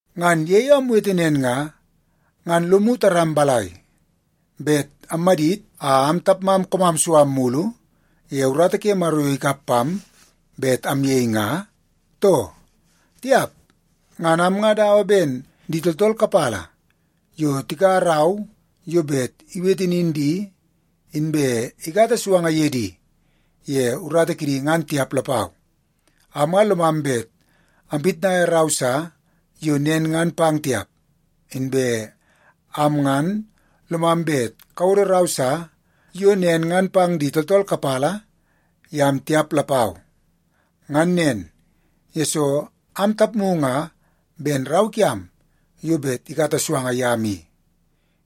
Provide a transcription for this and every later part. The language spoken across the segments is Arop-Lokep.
Ngan ye yo amwete nen nga, ngan lomu taram balai, bet ammadit a am tapmam koomam su am mulu ye urata ke Maro yo ikap pam bet amyei nga, too? Tiap! Ngan am nga dawa ben di tooltool kapala yo tikaua rau yo bet iwete nin di, inbe ikata suanga ye di ye urata kidi ngan tiap lapau. Am nga lomam bet ampitnaia rau sa yo nen ngan pang tiap, inbe am ngan lomam bet kawodo rau sa yo nen ngan pang di tooltool kapala yam tiap lapau. Ngan nen, yesoo ang tapmu nga ben rau kiam yo bet ikata suanga yam i.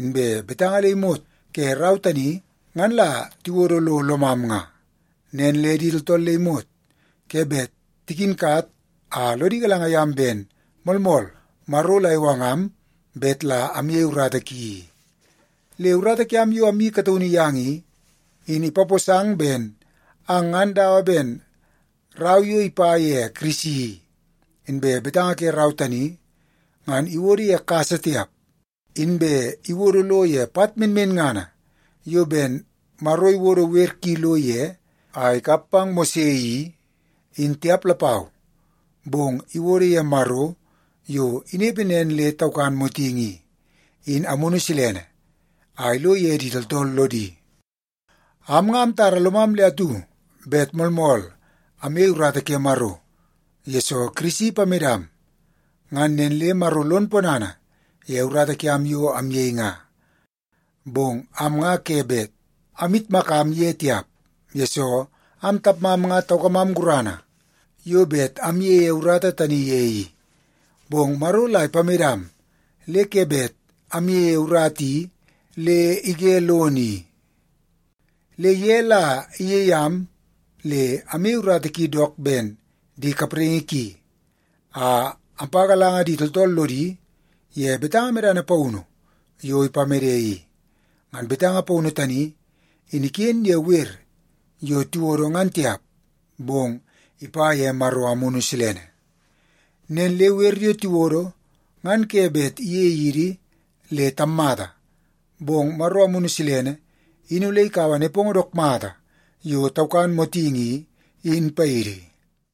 Inbe betanga le imot ke rau tani ngan la tiwodo lo lomam nga, nen le di tooltool le imot ke bet tikinkat a lodi galanga yam ben moolmool Maro la iwangam bet la amyei urata ki i. Le urata kiam yo amyeii kataunu yang i, in ipaposang ben ang ngan dawa ben rau yo ipa ye Kirisi i. Inbe betanga ke rau tani, ngan iwodo ye kasa tiap, inbe iwodo lo ye pat menmenngana yo ben Maro iwodo wer ki lo ye a ikap pang Mose i, in tiap lapau, bong iwodo ye Maro, yo inepe nen le taukan motingi i, in Amunu Silene a ilo ye di tooltool lodi. Am nga amtara lomam le atu bet moolmool amyei urata ke Maro, yesoo Kirisi ipamedam, ngan nen le Maro lon ponana ye urata kiam yo amyei nga. Bong am nga ke bet amyitmakam ye tiap, yesoo am tapmam nga taukamam gurana yo bet amyeie urata tani ye i. Bong Maro la ipamedam le ke bet amyeie urata i le ige lono i. Le ye la iyei am le amyei urata ki dook ben di kapraingi ki, a ampagalanga di tooltool lodi ye betanga medana paunu yo ipamede i. Ngan betanga paunu tani in iken ye wer yo tiwodo ngan tiap, bong ipa ye Maro Amunu Silene. Nen le wer yo tiwodo, ngan ke bet iyei idi le tammata, bong Maro Amunu Silene in ole ikaua nepongo dook mata yo taukan motingi i, in paidi.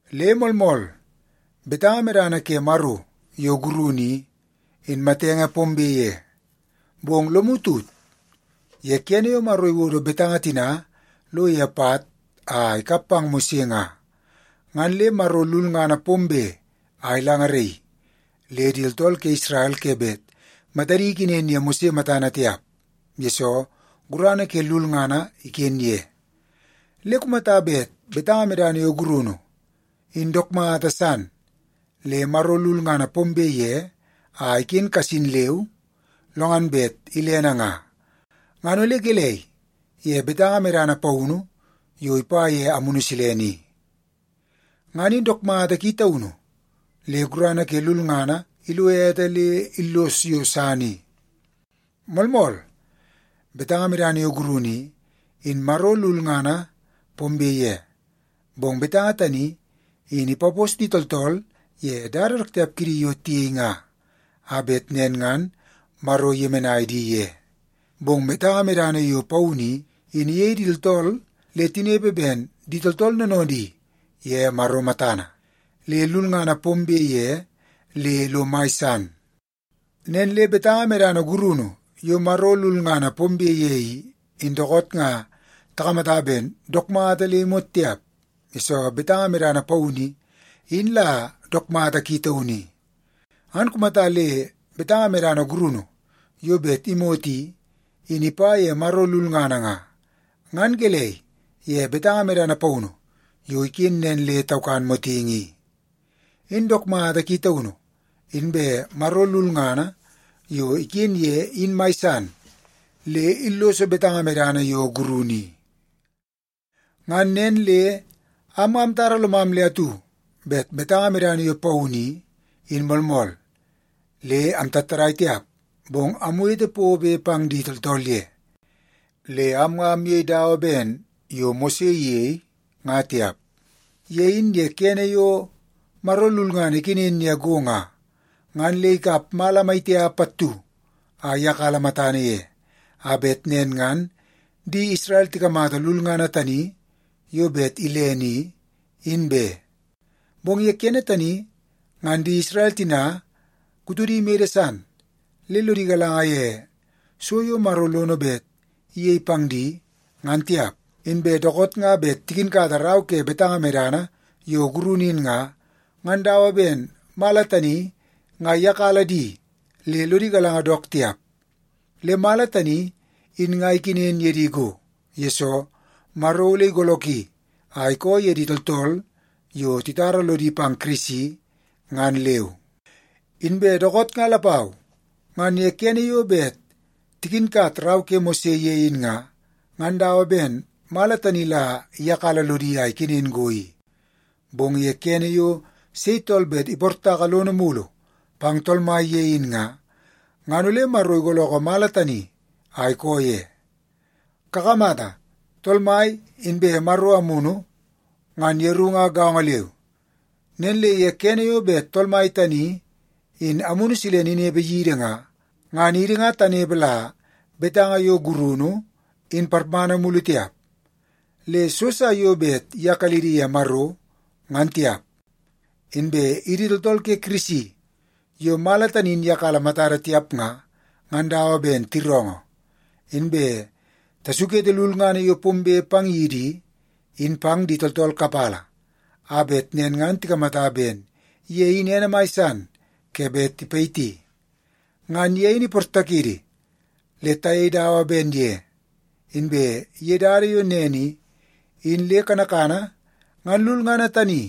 Le moolmool, betanga medana ke Maro yo gurunu i, in matenge pombe ye. Bong lomu tut, ye kene yo Maro iwodo betanga tina lo ye pat a ikap pang Mose nga, ngan le Maro lulngana pombe a ilangaraii, le di tooltool ke Isrel ke bet matadi ikenen ye Mose matana tiap, yesoo gurana ke lulngana iken ye. Le kumata bet betanga medana yo gurunu, in dook mata san le Maro lulngana pombe ye a iken kasin leu, lo ngan bet ilene nga, ngan ole gelei ye betanga medana paunu yo ipa ye Amunu Silene i? Ngan in dook mata ki taunu le gurana ke lulngana ilo ete le illoso yo san i. Moolmool, betanga medana yo gurunu i, in Maro lulngana pombe ye, bong betanga tani in ipapos di tooltool ye dada dook tiap kidi yo tiyei nga, a bet nen ngan Maro iyemenai di ye. Bong betanga medana yo paunu i, in iyei di tooltool le tinepe ben di tooltool noonoodi ye Maro matana. Le lulngana pombe ye le lo mai san. Nen le betanga medana gurunu yo Maro lulngana pombe ye i, in dookoot nga takamata ben dook mata le imot tiap, yesoo betanga medana paunu i, in la dook mata ki taunu i. Ngan kumata le betanga medana gurunu yo bet imot i, in ipa ye Maro lulngana nga, ngan gelei ye betanga medana paunu yo iken nen le taukan motingi i? In dook mata ki taunu, inbe Maro lulngana yo iken ye in mai san, le illoso betanga medana yo gurunu i. Ngan nen le am nga amtara lomam le atu bet betanga medana yo paunu i, in moolmool, le amtattadai tiap, bong amwete pobe pang di tooltool ye. Le am nga amyei dawa ben yo Mose iyei nga tiap. Ye in ye kene yo Maro lulngana ikenen ye go nga, ngan le ikap mala maitiap pattu a iyakala matana ye, a bet nen ngan di Isrel tikamata lulngana tani yo bet ilene i, in be. Bong ye kene tani, ngan di Isrel tina kutodi mede san, le lodi galanga ye so yo Maro lono bet iyei pang di, ngan tiap. Inbe dookoot nga bet tikinkata rau ke betanga medana yo gurunu in nga, ngan dawa ben mala tani nga iyakala di le lodi galanga dook tiap. Le mala tani in nga ikenen ye di go, yesoo Maro ole igoolooki a ikoo ye di tooltool yo titara lodi pang Kirisi, ngan leu. Inbe dookoot nga lapau, ngan ye kene yo bet tikinkat rau ke Mose ye in nga, ngan dawa ben mala tani la iyakala lodi a ikenen go i. Bong ye kene yo sei tool bet iportaka lono mulu pang Tool Mai ye in nga, ngan ole Maro igoolookoo mala tani a ikoo ye. Kakamata, Tool Mai inbe Maro Amunu, ngan yeru nga gaongo leu. Nen le ye kene yo bet Tool Mai tani in Amunu Silene inepe yidi nga, ngan idi nga tanepe la betanga yo gurunu, in parmana mulu tiap, le so sa yo bet iyakalidi ye Maro, ngan tiap. Inbe idi tooltool ke Kirisi yo mala tani in iyakala matada tiap nga, ngan dawa ben tiroongoo, inbe tasukete lulngana yo pombe pang yidi i, in pang di tooltool kapala a bet nen ngan tikamata ben ye in ene mai san ke bet tipayiti. Ngan ye in iportakidi le tayei dawa ben ye. Inbe ye dada yo nen i, in le kanakana ngan lulngana tani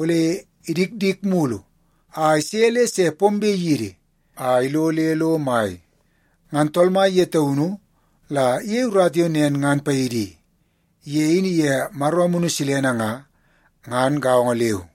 ole idikdik mulu a ise le se pombe yidi a ilo le lo mai. Ngan Tool Mai ye taunu la iyei urata yo nen ngan paidi i. Ye in iye Maro Amunu Silene nga, ngan gaongo leu.